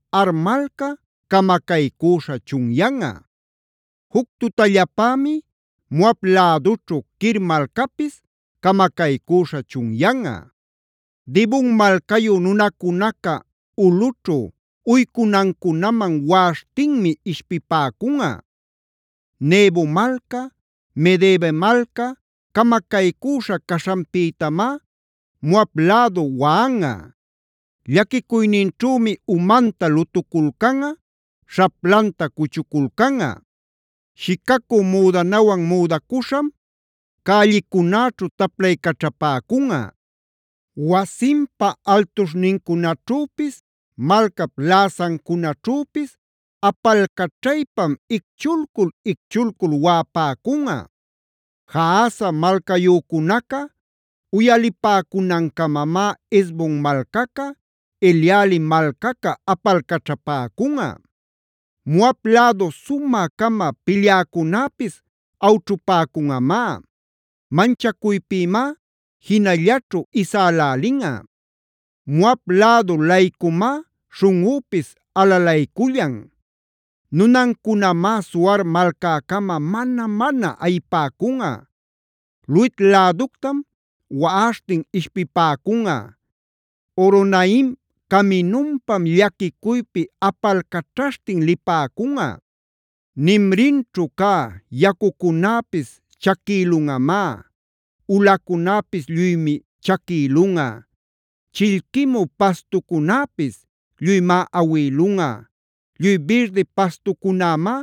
Ar malca, camacaycüśha chunyanꞌa. Juc tutallapämi Moab lädućhu Kir malcapis, camacaycüśha chunyanꞌa. Dibon malcayu nunacunaca ulꞌućhu uycunancunaman waꞌaśhtinmi ishpipäcunꞌa. Nebo malca, Medeba malca camacaycüśha caśhanpïtamá Moab lädu waꞌanꞌa. Llaquicuyninćhümi umanta lutuculcanꞌa, śhaplanta cuchuculcanꞌa. Shicacü müdanawan müdacuśham, cällicunäćhu taplaycaćhapäcunꞌa; wasinpa altuśhnincunaćhüpis, malcap läsancunaćhüpis apalcaćhaypam icchulcul-icchulcul waꞌapäcunꞌa. Jahaza malcayücunaca uyalipäcunancamamá Hesbon malcaca, Eleale malcaca apalcaćhapäcunꞌa. Moab lädu sumä-cama pilyäcunäpis awćhupäcunꞌamá; manchacuypïmá jinallaćhu isälälinꞌa. Moab lädu-laycumá śhunꞌüpis alalaycullan. Nunancunamá Zoar malcäcama mana-mana ayipäcunꞌa; Luhit läductam waꞌaśhtin ishpipäcunꞌa. Horonaim caminunpam, llaquicuypi apalcaćhaśhtin lipäcunꞌa. Nimrimćhu cä yacucunäpis chaquïlunꞌamá; ulacunäpis lluymi chaquïlunꞌa; chillquimü pastucunäpis lluymá awïlunꞌa; lluy birdi pastucunämá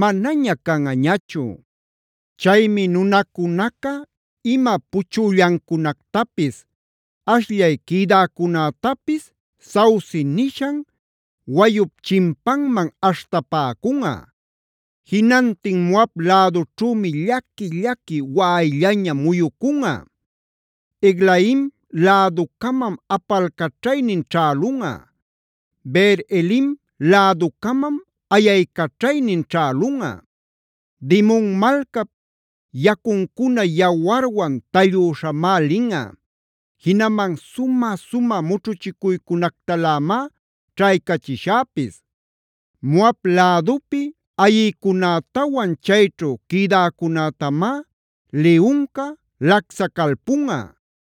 manaña canꞌañachu. Chaymi nunacunaca ima puchüllancunactapis, ashllay quïdäcunätapis Sauce nishan wayup chimpanman aśhtapäcunꞌa. Jinantin Moab lädućhümi llaqui-llaqui waꞌayllaña muyucunꞌa; Eglaim läducamam apalcaćhaynin ćhälunꞌa; Beer-elim läducamam ayaycaćhaynin ćhälunꞌa. Dimonb malcap yacuncuna yawarwan tallüśhamá linꞌa. Jinaman sumä-sumä mućhuchicuycunactalämá ćhaycachishäpis. Moab lädupi ayïcunätawan chayćhu quïdäcunätamá liyunca lacsacalpunꞌa.